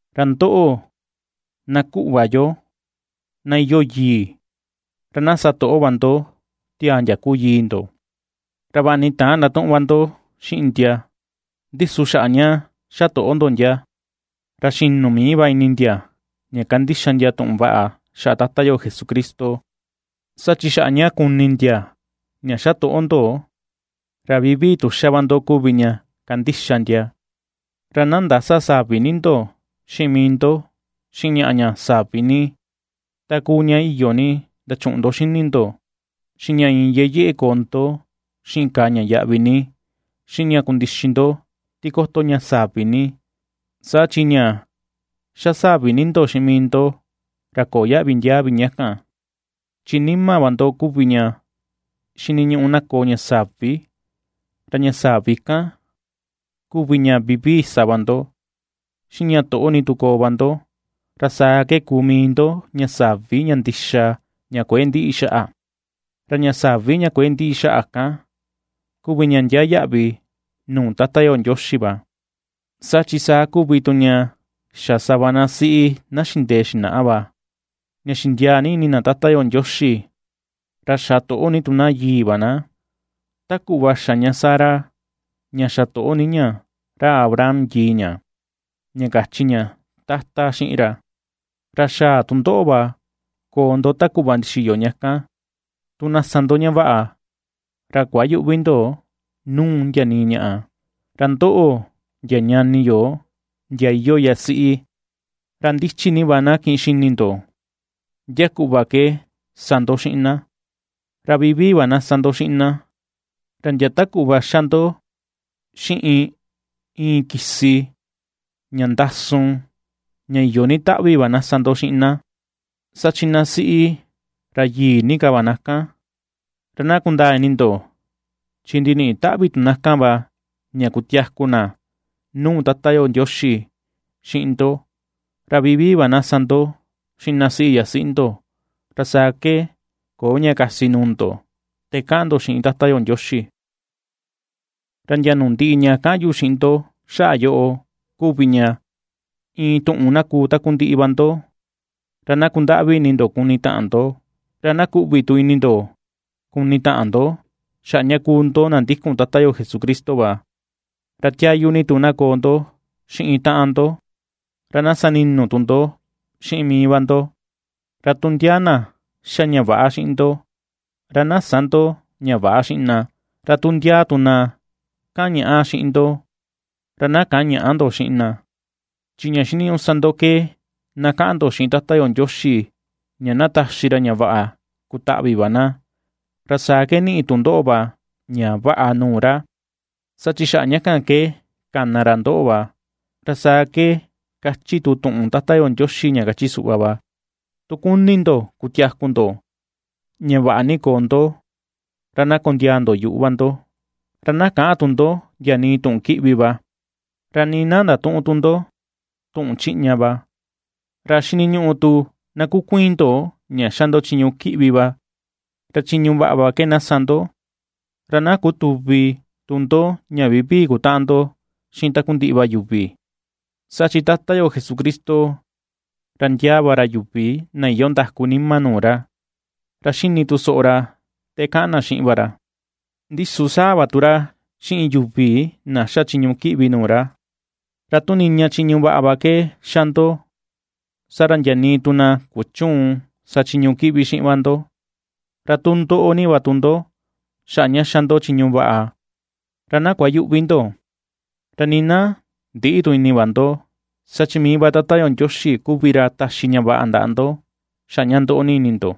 Ra ndoꞌo, na kuꞌva yo, na iyoo yii, ra na satoꞌo va ndo tiaa ndia kuu yii ndo, ra vaꞌa ni täan ndatuꞌun va ndo xiꞌin ndia, ndi su xaꞌa ña xa toꞌo ndo ndia, ra xinu mii va ini ndia ña kandixa ndia tuꞌun vaꞌa xaꞌa Tata yo Jesucristo. Saa chi xaꞌa ña kuni ndia ña xa toꞌo ndo, ra vivii tu xa va ndo kuvi ña kandixa ndia. Ra na ndäsa savi ni ndo mii ndo xiꞌin ñaꞌa ña savi ni: ta kuu ña iyo ni ndachuꞌun ndo xini ndo, xiꞌin ña iin yeꞌe yeꞌe koo ndo xiꞌin kàà ña yaꞌvi ni, xiꞌin ña kundixi ndo tikoto ña savi ni, saa chi ña ^xa savi ni ndo xiꞌin mii ndo ra köo yaꞌvi ndiaa vi ña kan. Chi nima va ndo kuvi ña xiniñuꞌu na koo ña savi, ra ña savi kan kuvi ña vivii sa va ndo, xiꞌin ña toꞌo ni tu koo va ndo, ra saa ke kuu mii ndo ña savi ña ndixa, ña kuëe ndïꞌi xaꞌa; ra ña savi ña kuëe ndiꞌi xa kan kuvi ña ndia yaꞌvi nuu Tata yo Ndioxi va. Saa chi saa kuvi tu ña xa sava na siꞌi na xindee xinaꞌa va, ña xindiaa ni ini na Tata yo Ndioxi, ra xa toꞌo ni tu na yii va na. Ta kuꞌva xa ña Sara, ña xa toꞌo ni ña ra Abraham yii ña, ña kachi ña “Tata” xiꞌin ra. Ra xaa tu ndoꞌo va koo ndo ta kuꞌva ndixiyo ña kan, tu na sa ndo ña vaꞌa, ra kuayüꞌvi ndo nuu ndia nii ñaꞌa. Ra ndoꞌo, ndia ñani yo, ndia iyoo yasiꞌi, ra ndichi ni va na kiꞌin xini ndo ndia kuꞌva ke sa ndo xiꞌin na, ra vivii va na sa ndo xiꞌin na, ra ndia ta kuꞌva xa ndo xiꞌin iin kisi ña ndasun, ña iyo ni taꞌvi va na sa ndo xiꞌin na, saa chi na siꞌi ra yii ni va na kan, ra na kundaa ini ndo chi ndiniꞌi taꞌvi tu na kan va ña kutiaku na nuu Tata yo Ndioxi xiꞌin ndo. Ra vivii va na sa ndo xiꞌin na siꞌi yasiꞌi ndo, ra saa ke köo ña kasi nuu ndo te kaꞌan ndo xiꞌin Tata yo Ndioxi. Ra ndia nuu ndiꞌi ña kaꞌan yu xiꞌin ndo xaꞌa yoꞌo kuvi ña, iin tuꞌun na kuu takundiꞌi va ndo, ra na kundaꞌvi ini ndo kuni taꞌan ndo, ra na kuꞌvi tu ini ndo kuni taꞌan ndo xaꞌa ña kuu ndo na ndikun Tata yo Jesucristo va. Ra tiayu ni tu na koo ndo xiꞌin taꞌan ndo, ra na sa ninu tu ndo xiꞌin mii va ndo. Ra tu ndia na xa ña väꞌa xiꞌin ndo, ra na sä ndo ña väꞌa xiꞌin na; ra tu ndia tu na kaꞌan ña̱ꞌà xiꞌin ndo, ra na käꞌan ña̱ꞌà ndo xiꞌin na. Chi ña xiniñuꞌu sa ndo ke na kaꞌan ndo xiꞌin Tata yo Ndioxi ña na taxi ra ña vaꞌa kutaꞌvi va na, ra saa ke niꞌi tu ndoꞌo va ña vaꞌa nuu ra, saa chi xaꞌa ña kan ke kana ra ndoꞌo va. Ra saa ke kachi tu tuꞌun Tata yo Ndioxi ña kachi suꞌva va: Tu kuni ndo kutiaku ndo, ña vaꞌa ni koo ndo, Ra na kondiaa ndo yuꞌu va ndo, ra na käꞌan tu ndo ndia nii tuꞌun kiꞌvi va; ra nii na ndatüꞌun tu ndo tuꞌun chiꞌña va. Ra xiniñuꞌu tu na kukuiin ndo ña ^xa ndo chiñu kiꞌvi va, ra chiñu vaꞌa va ke na sa ndo, ra na kutüvi tu ndo ña vivii kutaꞌan ndo xiꞌin takundiꞌi va yuvi. Saa chi Tata yo Jesucristo, ra ndiaa va ra yuvi na iyoo ndaku nima nuu ra, ra xini tu soꞌo ra te kaꞌan na xiꞌin va ra, ndi su sáa̱ va tu ra xiꞌin yuvi na xa chiñu kiꞌvi nuu ra. Ra tu niña chiñu vaꞌa va ke xa ndo, saa ra ndia nii tu na kuchüun sa chiñu kiꞌvi xiꞌin va ndo. Ra tu ndoꞌo ni va tu ndo xaꞌa ña xa ndo chiñu vaꞌa, ra na kuayüꞌvi ndo, ra nii na ndïꞌi tu ini va ndo, saa mii va Tata yo Ndioxi kuvi ra taxi ña vaꞌa ndaꞌa ndo xaꞌa ña ndoꞌo ni ini ndo.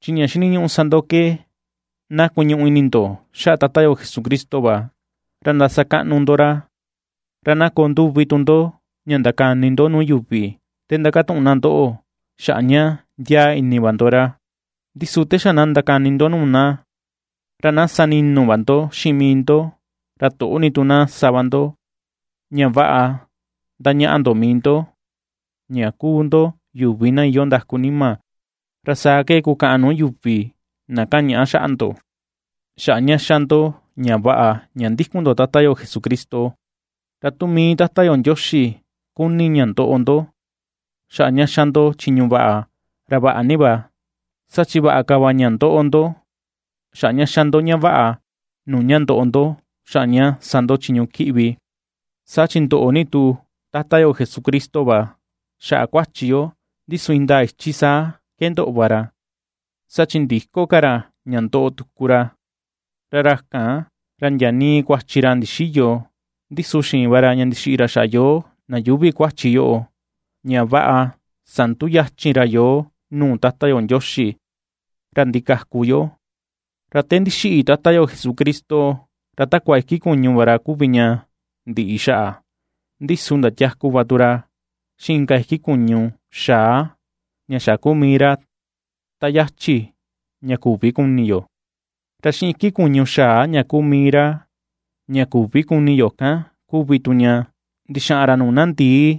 Chi ña xiniñuꞌu sa ndo ke na kuñuꞌu ini ndo xaꞌa Tata yo Jesucristo va, ra ndasakaꞌnu ndo ra. Ra na koo nduvi tu ndo ña ndakani ndo nuu yuvi te ndakatuꞌun na ndoꞌo xaꞌa ña ndiaa ini va ndo ra, ndi su te xa ndakani ndo nuu na, ra na sa ninu va ndo xiꞌin mii ndo, ra toꞌo ni tu na sa va ndo, ña vaꞌa ndañaꞌa ndo mii ndo ña kuu ndo yuvi na iyoo ndaku nima, ra saa ke kukaꞌan nuu yuvi na ka̱ꞌàn ñaꞌa xaꞌa ndo xaꞌa ña ^xa ndo ña vaꞌa ña ndikun ndo Tata yo Jesucristo. Ra tu mii Tata yo Ndioxi kuni ña ndoꞌo ndo xaꞌa ña xa ndo chiñu vaꞌa, ra vaꞌa ni va, saa chi vaꞌa ka va ña ndoꞌo ndo xaꞌa ña xa ndo ña vaꞌa, nuu ña ndoꞌo ndo xaꞌa ña sa ndo chiñu kiꞌvi. Saa chi ndoꞌo ni tu Tata yo Jesucristo va xaꞌa kuachi yo, ndi su indaa ichi saa ke ndoꞌo va ra, saa chi ndïko ka ra ña ndoꞌo tuku ra. Ra ra kan, ra ndia nii kuachi ra ndixïyo, ndi su xiin va ra ña ndixiꞌi ra xaꞌa yoo na yuuvi kuachi yoꞌo, ña vaꞌa sanduyachin ra yoo nuu Tata yo Ndioxi, ra ndikaku yo. Ra te ndixiꞌi Tata yo Jesucristo, ra takua iki kuñu va ra kuvi ña ndiꞌi xaꞌa, ndi su ndatiaku va tu ra xiꞌin inka iki kuñu xaa ña xa kuu mii ra ta yachi ña küvi kuni yo. Ra xiꞌin iki kuñu xaa ña kuu mii ra ña küvi kuni yo kan kuvi tu ña, ndixaꞌan ra nuu na ndi̱ì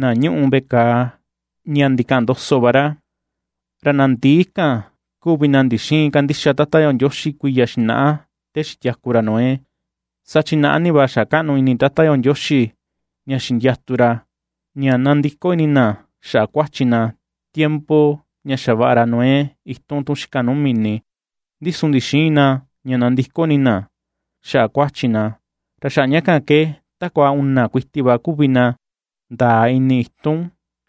na ñuꞌu veꞌe kàà ña ndikaꞌan ndoso va ra. Ra na ndi̱ì kan kuvi na ndixïin kandixa Tata yo Ndioxi kuiya xinaꞌa te xitiaku ra Noé, saa chi naꞌa ni va xa kaꞌnu ini Tata Ndioxi ña xindiatu ra, ña nandiko ini na xaꞌa kuachi na, tiempo ña xavaꞌa ra Noé itun tun xika nuu mini, ndi su ndixïin na ña nandiko ini na xaꞌa kuachi na, ra xaꞌa ña kan ke takua una kuiti va kuvi na ndaa ini itun tun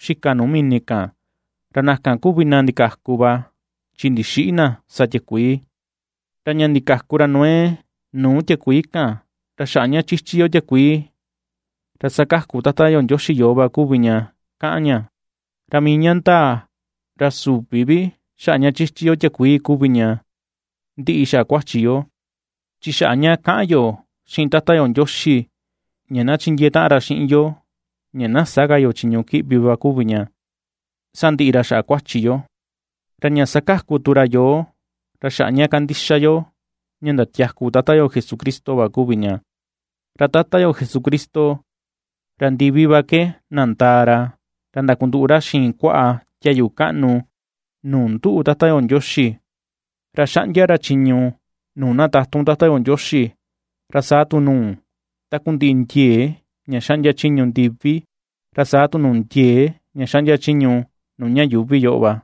xika nuu mini kan, ra na kan kuvi na ndikaku va chi ndixïꞌi na sa tiakuii kan. Ra ña ndikaku ra Noé nuu tiakuii kan, ra xaꞌa ña chichi yo tiakuii, ra sakaku Tata yo Ndioxi yoo va kuvi ña kaꞌan ña. Ra mii ña ndaa, ra süvi vi xaꞌa ña chichi yo tiakuii kuvi ña ndiꞌi xaꞌa kuachi yo, chi xaꞌa ña kaꞌan yo xiꞌin Tata yo Ndioxi ña na chindiee taꞌan ra xiꞌin yo ña na sä ka yo chiñu kiꞌvi va kuvi ña ^sandiꞌi ra xaꞌa kuachi yo. Ra ña sakaku tu ra yoo, ra xaꞌa ña kandixa yo ña ndatiaku Tata yo Jesucristo va kuvi ña. Ra Tata yo Jesucristo, ra ndivi va ke nandaa ra, ra ndakunduꞌu ra xiin kuaꞌa tiayu kaꞌnu nuu nduꞌu Tata yo Ndioxi, ra xaꞌndia ra chiñu nuu na tatun Tata yo Ndioxi, ra saa tu nuu takundiꞌi ndiee ña xaꞌndia chiñu ndivi, ra saa tu nuu ndiee ña xaꞌndia chiñu nuu ña yuuvi yoꞌo va.